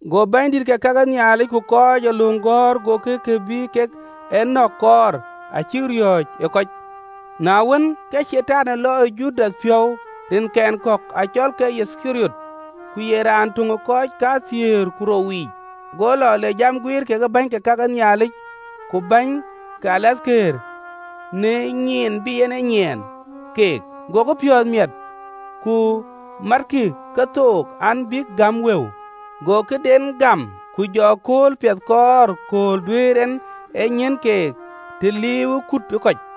Go bänydït ke ka ke Nhialic ku kɔc ee löŋ gɔ̈ɔ̈r gokï kë bï kek ë nɔ̈k kɔɔr, acïk riɔ̈ɔ̈c ë kɔc. Na wën, ke Catan lɔ ë Judath piɔ̈u, rinkɛn kɔ̈k acɔlke Yithkariɔt, ku ye raan töŋ ë kɔc kathiëër ku rou yiic. Go lɔ le jam guiir kekë bäny ke ka ke Nhialic ku bäny ke rem de tɔŋ ke Luaŋdït, në nyiin bï en en yiɛ̈n keek. Gokï piɔ̈ɔ̈th miɛt, ku matkï kethook, an bïk gäm wëu. Go këden gam, ku jɔ kööl piɛth kɔɔr kööl duëër en en yiɛ̈n keek të liiuwë kuut ë kɔc.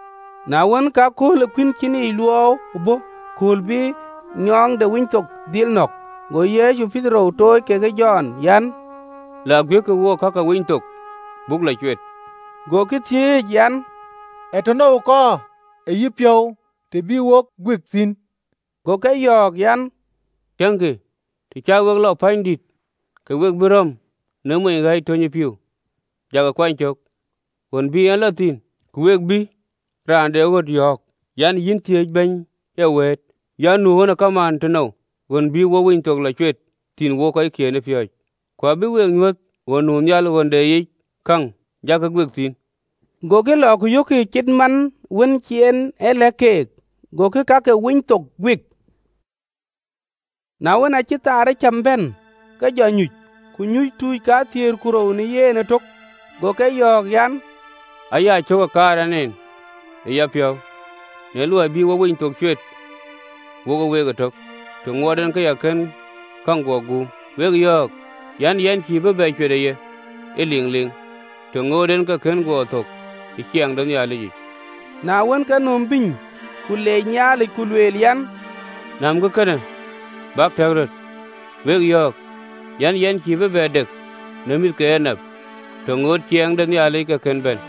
Na wën, ke akööl de Dhuëëŋ de Kuïn Cïnic Luɔu bɔ̈, kööl bï nyɔɔŋ de Winythok dhil nɔ̈k. Go Yecu Petero tooc kekë Jɔn an, “Lak guiëkkï wook ka ke Winythok, buk lɔ cuet.” Gokï thiëëc an, “Ee tënou kɔɔr ë yïpiɔ̈u të bï wok guik thïn?” Go ke yɔ̈ɔ̈k an, “Tiëŋkï, të cä wek lɔ pänydït, ke we bï rɔ̈m në mony ɣɛ̈ɛ̈c töny ë pïïu, jakï kuany cök ɣön bï en lɔ thïn. Ku we bï raan de ɣöt yɔ̈ɔ̈k an, ‘Yïn thiëëc Bɛ̈ny ee wëët an, Nu ɣön ë kamaan tënou, ɣön bï wo Winythok lɔ cuet thïn wokë kɔckiën ë piööcë?’ Ku abï we nyuöth ɣöndïït nu nhial ɣön de yic käŋ: jakï guik thïn.” Gokï lɔ, ku yökkï ke cït man cï en e lɛ̈k keek, gokï ka ke Winythok guik. Na wën, aacï thaar ee cam bɛ̈n, ke jɔ nyuc, ku nyuc tuuc kathiëër ku rou në yen ëtök. Go ke yɔ̈ɔ̈k an, “Aa ya cök ë kaar ɛn en ë yapiɔ̈u në luɔi bï wok Winythok cuet wokë week ëtök, të ŋuɔɔt ɛn ke ya kën käŋ guɔ guum. Wek yɔ̈ɔ̈k an, Yɛn cïï bï bɛ cuet ë ye ëliŋliŋ, të ŋoot en ke kën guɔ thök ë ciɛɛŋ de Nhialic.” Na wën, ke nöm bïny, ku leec Nhialic, ku lueel an, “Nämkï kënë, bäk tɛ̈k röt. Wek yɔ̈ɔ̈k an, Yɛn cïï bï bɛ dek në mïth ke enap, të ŋootë ciɛɛŋ de Nhialic ke kën bɛ̈n.”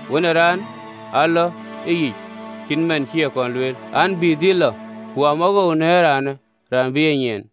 Wën ë Raan alɔ, ëyic, cït man cï e kɔn lueel an, bï dhil lɔ: ku amawoou në ëraanë raan bï e nyiɛɛn!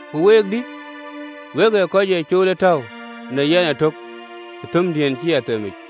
Ku week, dï, wek ee kɔc ee cool ë tɔ̈u në yɛn ëtök ë thëmdiën cï a themic,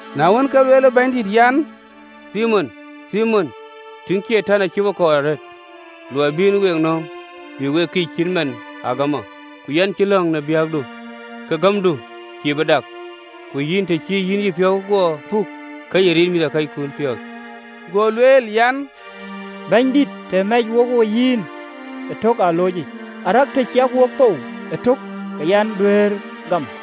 “Na wën, ke lueel Bɛ̈nydït an, “Thimon, tïŋ, Catan acï we kɔɔr arëët luɔi bï en we nööm, bï we kïïc cït man ë agamɔ: ku yɛn cï lɔ̈ŋ në biäkdu, ke gämdu cïï bï dak: ku yïn, të cï yïn yïpiɔ̈u guɔ puk, ke yï rit mïthëkɔckun piɔ̈ɔ̈th.” Go lueel an, “Bɛ̈nydït, të mɛcë wo wo yïn ëtök ë alooc yic, arëk të ciɛk wok thou ëtök, ke yɛn duëër gam!”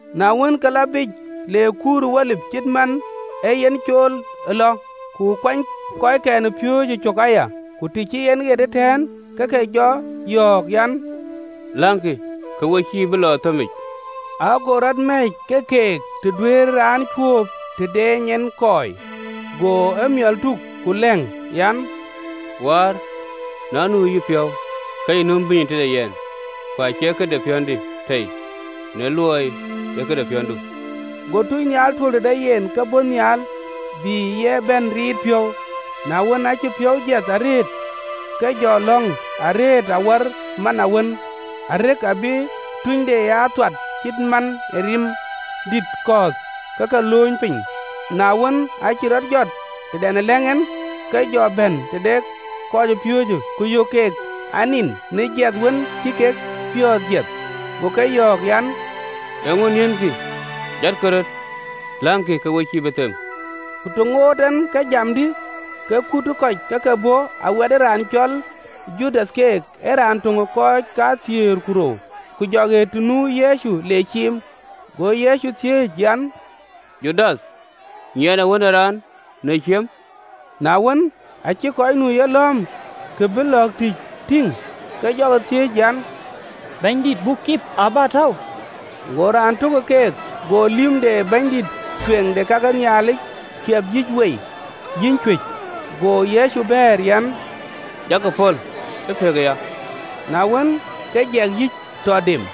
Na wën, ke lɔ biic, le kuur ë Olip, cït man ee yen cool ë lɔ, ku kuɛny kɔckɛn ë piööcë cök aya. Ku të cï en ɣet ëtɛ̈ɛ̈n, ke ke jɔ yɔ̈ɔ̈k an, “Läŋkï, ke we cïï bï lɔ ë thëmic.” Ago rɔt mɛ̈ɛ̈c ke keek të duëër raan cuööp të dɛɛny en kɔɔi, go emiɔl tuk, ku lɛ̈ŋ, An, “Wäär na nu ë yïpiɔ̈u, ke yï nöm bïnyë tëde yɛn, ku acie këde piɔ̈ndï tei, tɔ loi ee këde piɔ̈ndu.” Go tunynhial tuöl tëde yen, ke bɔ̈ nhial, bï ye bɛ̈n riit piɔ̈u. Na wën, aacï piɔ̈u jiɛth arëët, ke jɔ lɔ̈ŋ arëët awär man awën: arëk abï tunyde aa thuat cït man ë rim dït kɔ̈ɔ̈th ke ke lööny piny. Na wën, aacï rɔt jɔt tëdɛn ë lɛ̈ŋ en, ke jɔ bɛ̈n tëde kɔcpiööcë, ku yök keek anin në jiɛth wën cï kek piɔ̈ɔ̈th jiɛth. Go ke yɔ̈ɔ̈k an, “Eeŋö niënkï? Jatkï röt, läŋkï, ke we cïï bï them.” Ku të ŋoot en ke jam, dï, ke kut ë kɔc ë ke bɔ̈, awɛt raan cɔl Judath keek, ee raan töŋ de kɔc kathiëër ku rou, ku jɔ ɣet të nu Yecu le ciim. Go Yecu thiëëc an, “Judath, nyiɛɛnë Wën ë Raan në ciëm?” Na wën, aacï kɔc nu ë yelɔ̈ɔ̈m kë bï lɔ̈ɔ̈k tïc tïŋ, ke jɔkï thiëëc an, “Bɛ̈nydït, buk kip ë abätäu?” Go raan tök ë keek go lïm de bɛ̈nydïït ë kake Nhialic kiɛp yïc wei, yïny cuëc. Go Yecu bɛ̈ɛ̈r an, “Jakï pɔ̈l ë pëk aya!” Na wën, ke jiɛk yïc, tɔ dem.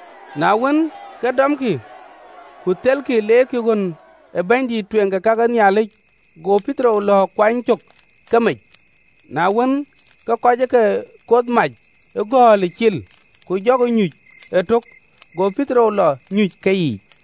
Na wën, ke dɔmkï, ku thelkï, leerkï ɣön ë bɛ̈nydïït ë kake Nhialic. Go Petero lɔ̈ɔ̈k kuany cök ke mec. Na wën, ke kɔc ë ke koth mac ë gɔ̈ɔ̈lic cil, ku jɔkï nyuc ëtök, go Petero lɔ nyuc ë keyiic.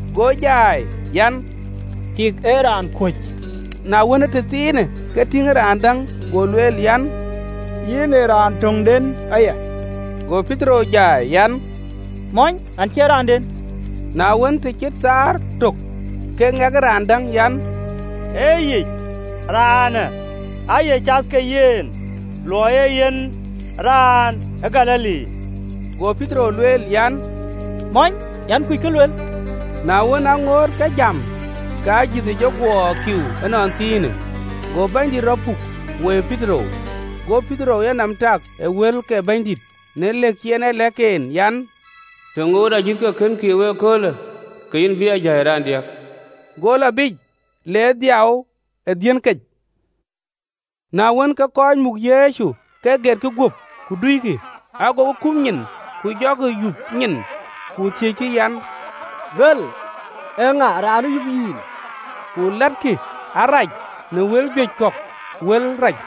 Go jai an, “Tik, ee raan kuöc!” Na wën, ee tëthiinë, ke tïŋ raan däŋ, go lueel an, “Yïn ee raan töŋden aya!” Go Petero jai an, “Mɔny, yɛn cie raanden!” Na wën, të cït thaar tök, ke ŋɛk ë raan däŋ an, “Ee yic, raanë aaye cath ke yen, ë luɔi ee yen raan ë Galili!” Go Petero lueel an, “Mɔny, yɛn kuc kë lueel!” Na wën, aŋoot ke jam, ke ajïth jɔ guɔ kiiu ënɔnthiinë. Go Bɛ̈nydït rɔt puk, woi Petero. Go Petero yenɔm tak ë wël ke Bɛ̈nydït, në lëk cï en e lɛ̈k en an, “Të ŋootë ajïth ke kën kiiu ee köölë, ke yïn bï a jai raandiäk.” Go lɔ biic, le dhiau ë dhiën kec. Na wën, ke kɔc muk Yecu ke getkï guöp, ku duikï. Agokï kum nyin, ku jɔkï yup nyin, ku thiëckï an, “Luel! Eeŋa raan ë yup yïn?” Ku lɛ̈ɛ̈tkï arac në wël juëc kɔ̈k wël rac.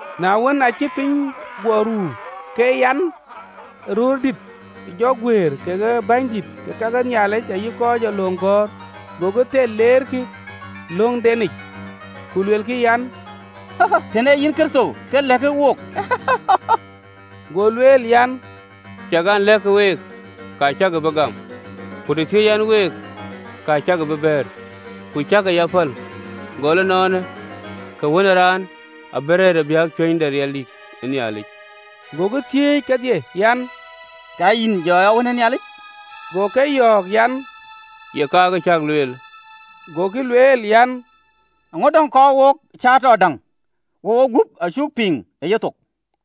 Na wën, aacï piny guɔ ruu, ke amatnɔm ë röördït jɔ guëër, kekë bänydït ke ka ke Nhialic ayï kɔc ee löŋ gɔ̈ɔ̈r, gokï thel leerkï ë löŋdenic, ku luelkï an, “Tën ee yïn Kërtho, ke lɛ̈kë wook.” Go lueel an, “Ciɛk an, lɛ̈k week, ka cäkï bï gam, ku të thiɛ̈ɛ̈c ɛn week, ka cäkï bï bɛ̈ɛ̈r, ku cäkï ya päl. Gɔl ënɔɔnë, ke Wën ë Raan abï rëër ë biäk cuëny de riɛldïït ë Nhialic.” Gokï thiëëc kedhie an, “Ka yïn jɔ ya Wën ë Nhialic?” Go ke yɔ̈ɔ̈k an, “Ye ka, kë cäk lueelë.” Gokï lueel an, “Eeŋö däŋ kɔɔr wok cäätɔ däŋ? Wogup acuk piŋ ë yethok!”